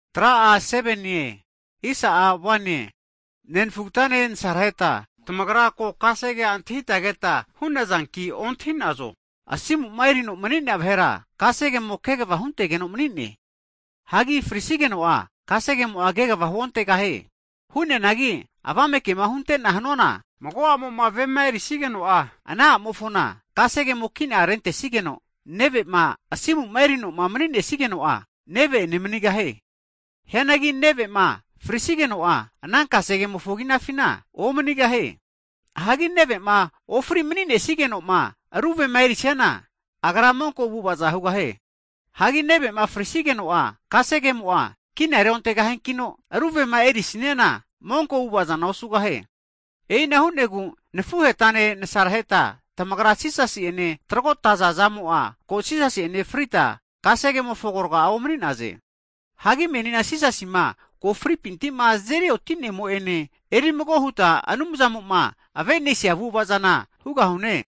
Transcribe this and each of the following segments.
Hagi nenfugatane nasaraheta, tamagra ko kasegea antahita keta hu'nazanki ontahi'nazo, asimu'ma erino mani'nea vahera kasegemo kegava huntegeno mani'ne. Hagi frisigeno'a kasegemo'a kegava huontegahie. Hu'neanagi avame kema hunte'na hanuana, mago a'mo'ma vema erisigeno'a, ana a'mofona kasegemo kina rentesigeno, neve'ma asimu'ma erinoma mani'nesigeno'a neve'ene manigahie. Hianagi neve'ma frisigeno'a, ana kasegemofo kinafina omanigahie. Hagi neve'ma ofri mani'nesnigeno'ma ru vema erisiana agra monko avu'avaza hugahie. Hagi neve'ma frisigeno'a kasegemo'a kina reontegahiankino, ru vema erisaniana monko avu'ava zana osugahie. E'ina hu'negu, nafuhetane nasaraheta tamagra Jisasi'ene tragotaza zamo'a ko Jisasi'ene frita, kasegemofo agorga omani'naze. Hagi menina Jisasima ko fripinti'ma azeri otinemo'ene erimago huta Anumzamo'ma ave'nesia avu'ava zana hugahune.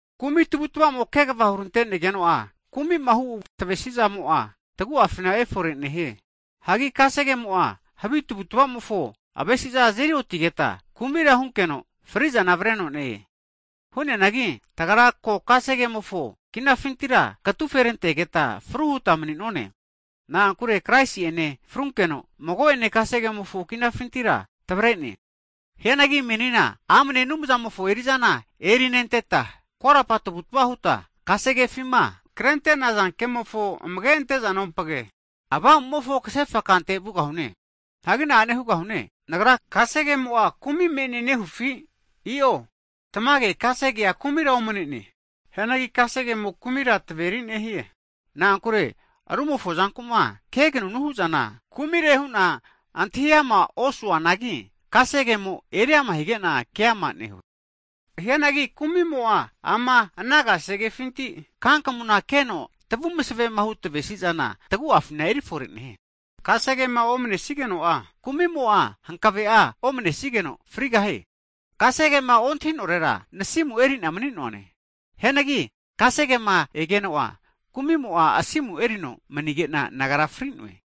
Kumi tavutavamo kegava hurantenegeno'a, kumima hu' tavesizamo'a tagu'afina efore nehie. Hagi kasegemo'a havi tavutvamofo avesiza azeri otigeta, kumira hunkeno frizana avreno ne-e. Hu'neanagi tagra ko kasegemofo kinafintira katuferantegeta fru huta mani'none. Na'ankure Kraisi'ene frunkeno mago'ene kasegemofo kinafintira tavre'ne. Hianagi menina amne Anumzamofo erizana erinenteta, korapa tavutva huta kasegefima krente'naza kemofo amage' ante'zanompage, Avamumofo kasefa kante vugahune. Hagi na'ane hugahune, nagra kasegemo'a kumi me'ne nehufi? I'o. Tamage kasegea kumira omnene. Hianagi kasegemo kumira tamaveri nehie. Nagrama rumofo zanku'ma kenunu hu'zana, kumire hu'na antahi amara osuanagi, kasegemo eriama hige'na keama nehue. Hianagi kumimo'a ama ana kasegefinti kankamunku keno tavu masevemahu tavesizana, tagu'afina erifore nehie. Kasegema omanesigeno'a kumimo'a hankave'a omanesigeno frigahie. Kasegema ontahinorera nasimu erina mani'noane. Hianagi kasegema egeno'a kumimo'a asimu erino mani'gena nagra fri'noe.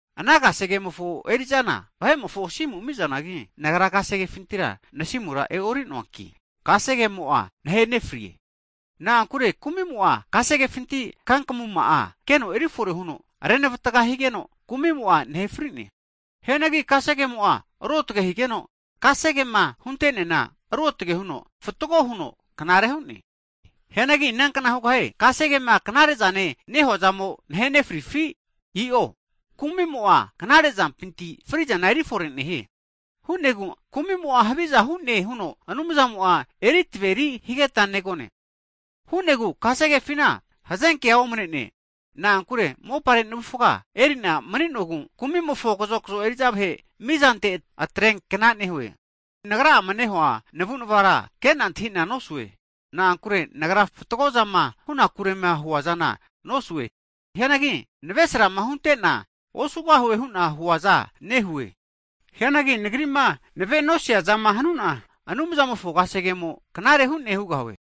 Ana kasegemofo eri'zana vahe'mofo asimu ami'zanagi, nagra kasegefintira nasimura e'noruanki, kasegemo'a nahenefrie. Na'ankure kumimo'a kasegefinti kankamuma'a keno erifore huno renavatga higeno kumimo'a nahe fri'ne. Hianagi kasegemo'a ruotge higeno, kasegema hunte'neana ruotage huno fatgo huno knare hu'ne. Hianagi inankna hugahie, kasegema knarezane nehuazamo nahe nefrifi? I'o, kumi'mo'a knare zampinti frizana erifore nehie. Hu'negu kumi'mo'a haviza hu'ne huno Anumzamo'a kasegea eri taveri higeta negone. Hu'negu kasegefina hazenkea omane'ne, na'ankure mopare navufga eri'na mani'nogu kumimofo kazokzo eri'za vahe' mizante atreankna nehue. Nagra'ama nehua navunavara kena antahina nosue. Na'ankure nagra fatgo zama hunakurema huazana nosue. Hianagi navesarama hunte'na osugahue hu'na huaza nehue. Hianagi nagri'ma navenosia zama hanuna, Anumzamofo kasegemo knare hu'ne hugahue.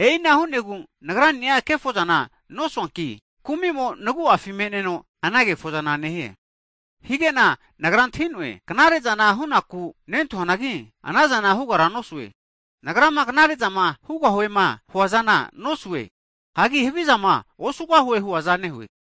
E'ina hu'negu nagrani'a kefozana nosuanki, kumimo nagu'afi me'neno ana kefozana nehie. Higena nagra antahi'noe, knare zana nagu'afina omane'ne. Knare zana hu'nakure hu'na nentahuanagi, anazana hugara nosue. Nagrama knare'zama hugahuema huazana nosue, hagi havizama osugahue huaza nehue.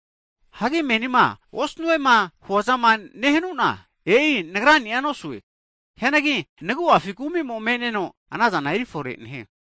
Hagi menima osnuema huazama nehuana, e'i nagrani'a nosue. Hianagi nagu'afina kumi'mo me'neno, anazana erifore nehie.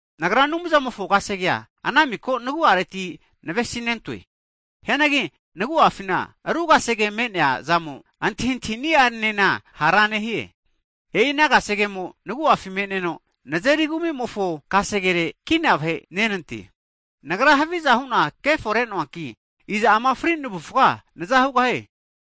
Nagra Anumzamofo kasegea ana miko nagu'areti navesinentoe. Hianagi nagu'afina ru kasege me'nea zamo antahintahini'anena hara nehie, e'i ana kasegemo nagu'afi me'neno nazeri kumi'mofo kasegere kina vahe'nenante. Nagra haviza hu'na keforenoanki, iza ama fri navufga naza hugahie?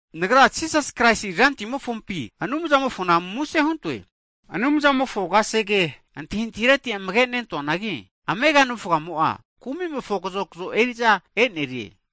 Nagra Jisas Kraisi Rantimofompi Anumzamofona muse huntoe, Anumzamofo kasegea antahintahini'areti amage nentuanagi, amega navufgamo'a kumimofo kazokzo eri'za e'nerie.